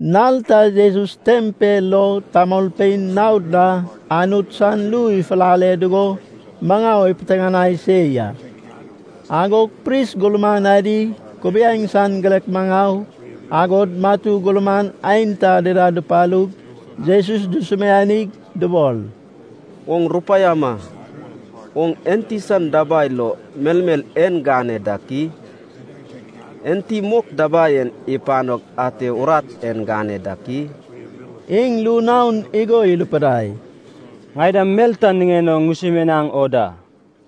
Nal ta Jesus tempel lo tamolpein naod na Anut san ru ifulale dugo maŋau ipiteŋanai se ya. Agog pris gurman adi, kubiaeŋ san girek maŋau, agod matu gurman aenta dida dupalug Jesus dusumianig dubol, “Oŋ rupaiama. Oŋ enti san dabai lo melmel en gane dak i? Enti mok dabai en ipanog ate urat en gane dak i?” Iŋ ru naon igo irupidai, “Ŋai dam mel ta niŋen o ŋusumianaŋ o da.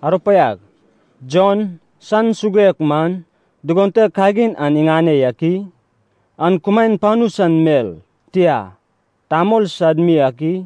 Arupaiag, Jon san suguek man, dugon te kagin an iŋane yak i? An kumaen panu san mel, tia, tamol sad mi ak i?”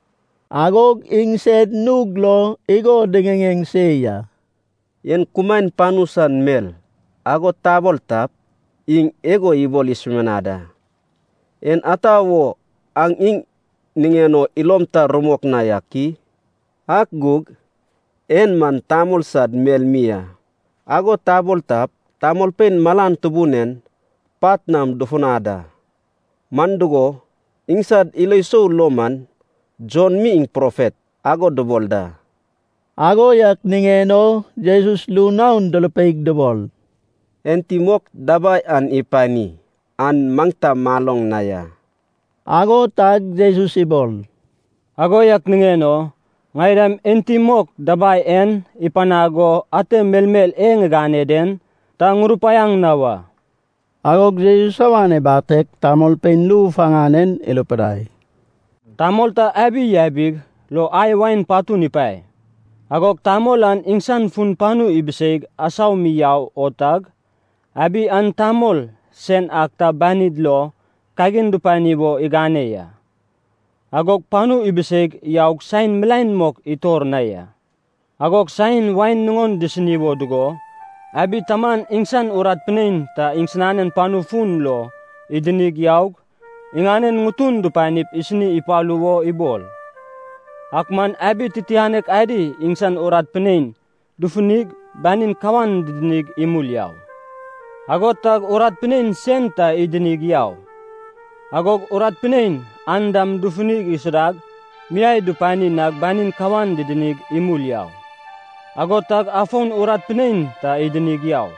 Agog iŋsed nug lo igo diŋiŋeŋ se ya. “En kumaen panu san mel, ago tabol tap, iŋ igo ibol isumianad a, ‘En ata wo aŋ iŋ niŋen o ilom ta rumok na yak i?’ Ak gug ‘En man tamol sad mel mi a,’ ago tabol tap, tamolpein malan tubun en pat nam dufunad a. Man dugo, iŋsad ilo sou lo man Jon mi iŋ profet, ago dubol da.” Ago yak niŋen o Jesus ru naon durupeig dubol, “Enti mok dabai an ipani an maŋ ta maloŋ na ya.” Ago tag Jesus ibol, “Ago yak niŋen o ŋai dam enti mok dabai en ipanag go ate melmel e ŋigane den, ta ŋurupaiaŋ na wa.” Agog Jesus awan ibateg tamolpein ru faŋan en irupidai, “Tamol ta abi yabig lo ai wain patun ipae. Agog tamol an iŋsan fun panu ibiseig asau mi yau o tag, abi an tamol sen ak ta banid lo kagin dupani wo igane ya. Agog panu ibiseig yaug saen milaen mok itor na ya. Agog saen wain nuŋon disini wo dugo, abi taman iŋsan urat pinein ta iŋsinanen panu fun lo idinig yaug, iŋanen ŋutun dupanip isini ipalu wo ibol. Ak man abi titianek adi iŋsan urat pinein dufunig banin kawan didinig imul yau. Ago tag urat pinein sen ta idinig yau. Agog urat pinein an dam dufunig isudag miai dupani nag banin kawan didinig imul yau. Ago tag afon urat pinein ta idinig yau,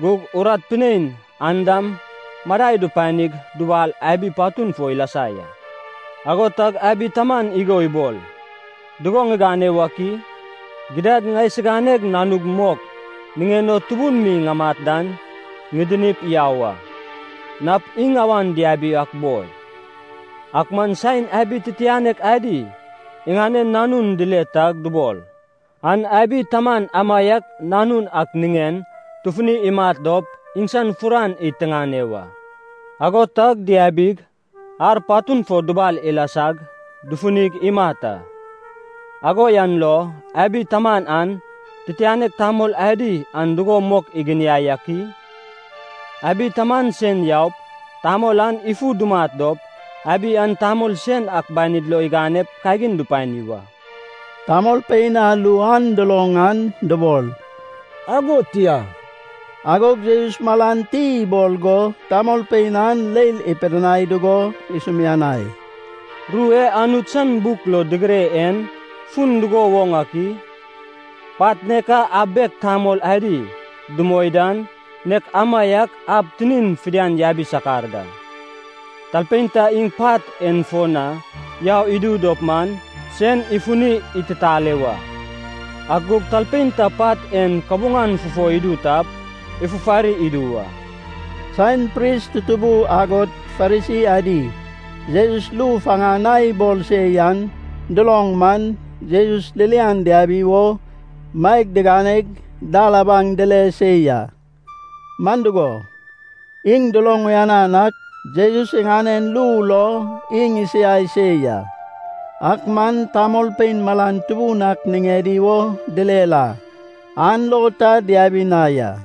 gug urat pinein an dam madai dupanig dubal abi patun fo ilasa ya. “Ago tag abi taman igo ibol, ‘Dugo ŋigane wak i? Gidad ŋaisiganeg nanug mok niŋen o tubun mi ŋamat dan ŋidinip yau a. Nap iŋ awan diabi ak boi.’ “Ak man saen abi titianek adi iŋanen nanun dile tag dubol, ‘An abi taman amaiak nanun ak niŋen tufuni imat dop, iŋsan furan id tiŋane wa!’ Ago tag diabig, ar patun fo dubal ilasag, dufunig imat a. “Ago yan lo abi taman an, titianek tamol adi an dugo mok iginiai ak i? Abi taman sen yaup tamol an ifu dumat dop, abi an tamol sen ak banid lo iganep kagin dupani wa.” Tamolpein a ru an duloŋ an dubol, “Ago tia!” Agog Jesus malan ti ibol go tamolpein an leil ipidinai dugo isumianai, “Ru e Anut san buk lo digire en fun dugo woŋ ak i? ‘Pat nek a ab bek tamol adi dumoi dan, nek amaiak ab tinin fidian yabi sakar da.’ Talpein ta iŋ pat en fo na yau idu dop man, sen ifuni ititale wa. Ak gug talpein ta pat en kabuŋan fufo idu tap, ifufari idu wa.” Saen pris tutubu agod Farisi adi, Jesus ru faŋan a ibol se yan duloŋ man, Jesus ririan diabi wo maeg diganeg dal abaŋ dile se ya. Man dugo, iŋ duloŋ uyanan ak Jesus iŋanen ru lo iŋ isiai se ya. Ak man tamolpein malan tubun ak niŋedi wo direr a, an lo ta diabi na ya.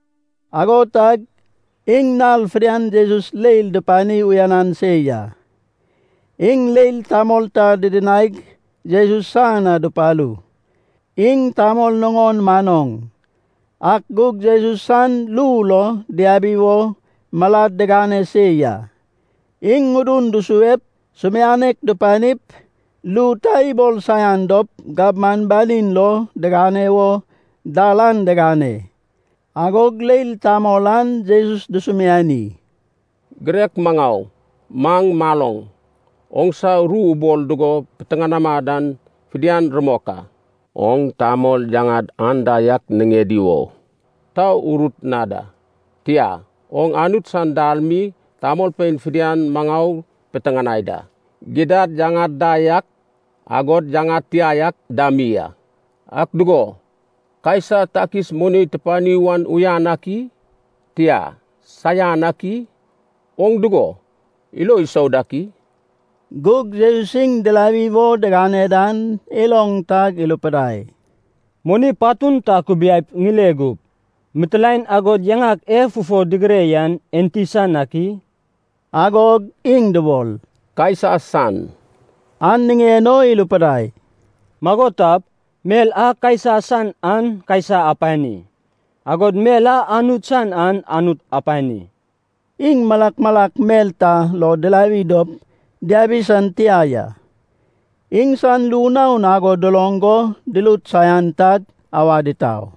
Ago tag iŋ nal fidian Jesus leil dupani uyanan se ya. Iŋ leil tamol ta didinaig Jesus san na dupalu. Iŋ tamol nuŋon manoŋ, ak gug Jesus san ru lo diabi wo malad digane se ya. Iŋ ŋudun dusuep sumianek dupanip, ru ta ibol saian dop gabman banin lo digane wo dal an digane. Agog leil tamol an Jesus dusumiani, “Girek maŋau, maŋ maloŋ, oŋsa ru ubol dugo piteŋanama dan fidian rumok a. Oŋ tamol yaŋad anda yak niŋedi wo ta urut na da. Tia, oŋ Anut san dal mi tamolpein fidian maŋau piteŋanai da. Gidad yaŋad da yak, agod yaŋad tia yak dam mi a. Ak dugo, Kaisa takis moni tupani wan uyan ak i? Tia, saian ak i? Oŋ dugo ilo isou dak i?” Gug Jesus iŋ dirawi wo digane dan iloŋ tag irupidai, “Moni patun ta akubiaip ŋile gup. Mitilaen agod yaŋak e fufo digire yan enti san ak i?” Agog iŋ dubol, “Kaisa san.” An niŋen o irupidai, “Mago tap, mel a Kaisa san an Kaisa apani. Agod mel a Anut san an Anut apani.” Iŋ malak malak mel ta lo dirawi dop diabi san tia ya. Iŋsan ru naon ago duloŋ go durut saian tag awad itau.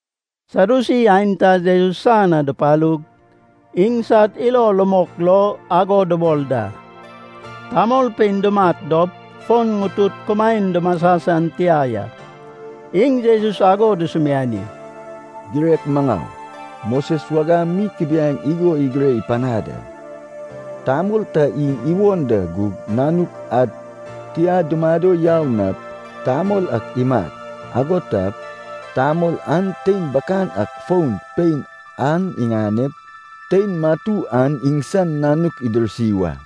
Sadyusi aenta Jesus san na dupalu. (Iŋsad ilo rumok lo ago dubol da: Tamolpein dumat dop, fon ŋutud kumaen dumasa san tia ya.) Iŋ Jesus ago dusumiani, “Girek maŋau, Moses wagam mi kubiaeŋ igo igire panad a, ‘Tamol ta iŋ iwon da gug nanuk ad tia dumado yau nap, tamol ak imat. Ago tap tamol an tein bakan ak fon pein an iŋanep, tein matu an iŋsan nanuk idirsi wa.’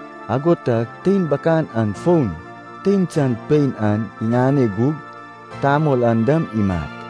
Ago tag tein bakan an fon tein san pein an iŋane gug tamol an dam imat.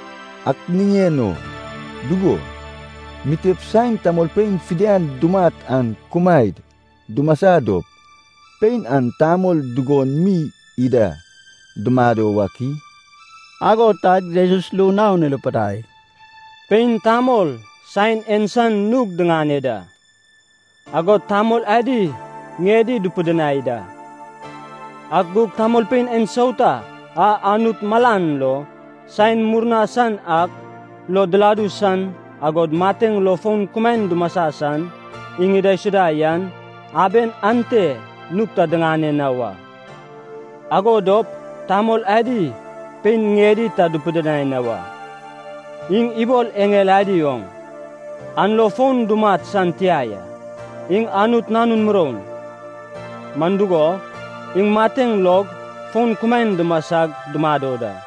Ak niŋen o, dugo, mitep saen tamolpein fidian dumat an kumaed dumasa dop, pein an tamol dugon mi ida dumado wak i?” Ago tag Jesus ru naon irupidai, “Pein tamol saen en san nug diŋane da, agod tamol adi ŋiedi dupidinai da. Ak gug tamolpein ensauta a Anut malan lo saen murna san ak lo diladu san, agod mateŋ lo fon kumaen dumasa san, iŋ idaisuda yan, aben ante nug ta diŋane na wa, ago dop tamol adi pein ŋiedi ta dupidinai na wa. Iŋ ibol eŋel adi oŋ, an lo fon dumat san tia ya. Iŋ Anut nanun muroun. Man dugo, iŋ mateŋ log fon kumaen dumasag dumado da.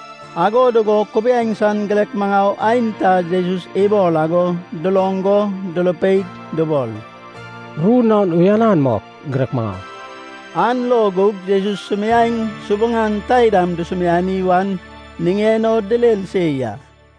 Ago dugo kubiaeŋ san girek maŋau aenta Jesus ibol ago duloŋ go durupeig dubol, “Ru naon uyanan mok, girek maŋau!” An lo gug Jesus sumiaeŋ subuŋan taidam dusumiani wan niŋen o direr se ya.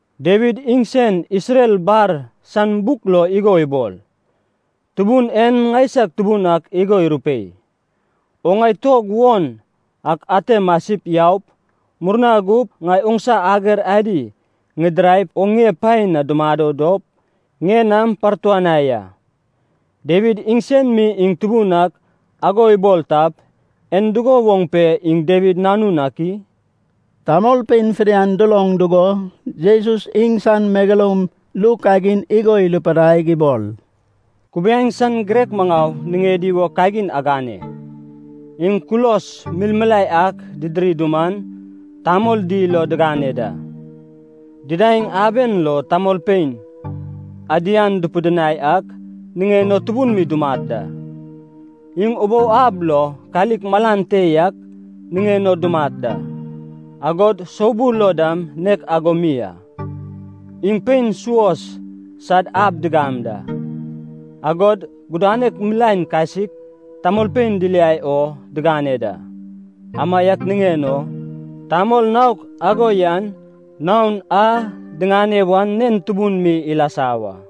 Dawid iŋsen Isrel bar san buk lo igo ibol, ‘Tubun en ŋaisag Tubun ak igo irupei, “Oŋ ŋai tuog won ak ate masip yaup, murna gup ŋai oŋsa ager adi ŋidiraip, oŋ ŋie pae na dumado dop ŋie nam partuanai a.” ’ Dawid iŋsen mi iŋ Tubun ak ago ibol tap, en dugo woŋ pe iŋ Dawid nanun ak i?” Tamolpein fidian duloŋ dugo, Jesus iŋsan megeloum ru kagin igo irupidaig ibol, “Kubiaeŋ san girek maŋau niŋedi wo kagin agane. Iŋ kulos milmilae ak didiri duman, tamol dil o digane da. Didaeŋ aben lo tamolpein ‘adian’ dupidinai ak niŋen o tubun mi dumat da. Iŋ ubou ab lo kalik malan te yak niŋen o dumat da, agod soubul lo dam nek ago mi a. Iŋ pein suos sad ab digam da, agod gudanek milaen kasik, tamolpein diliai o digane da. Amaiak niŋen o tamol naok ago yan naon a diŋane wan nen tubun mi ilasa wa.”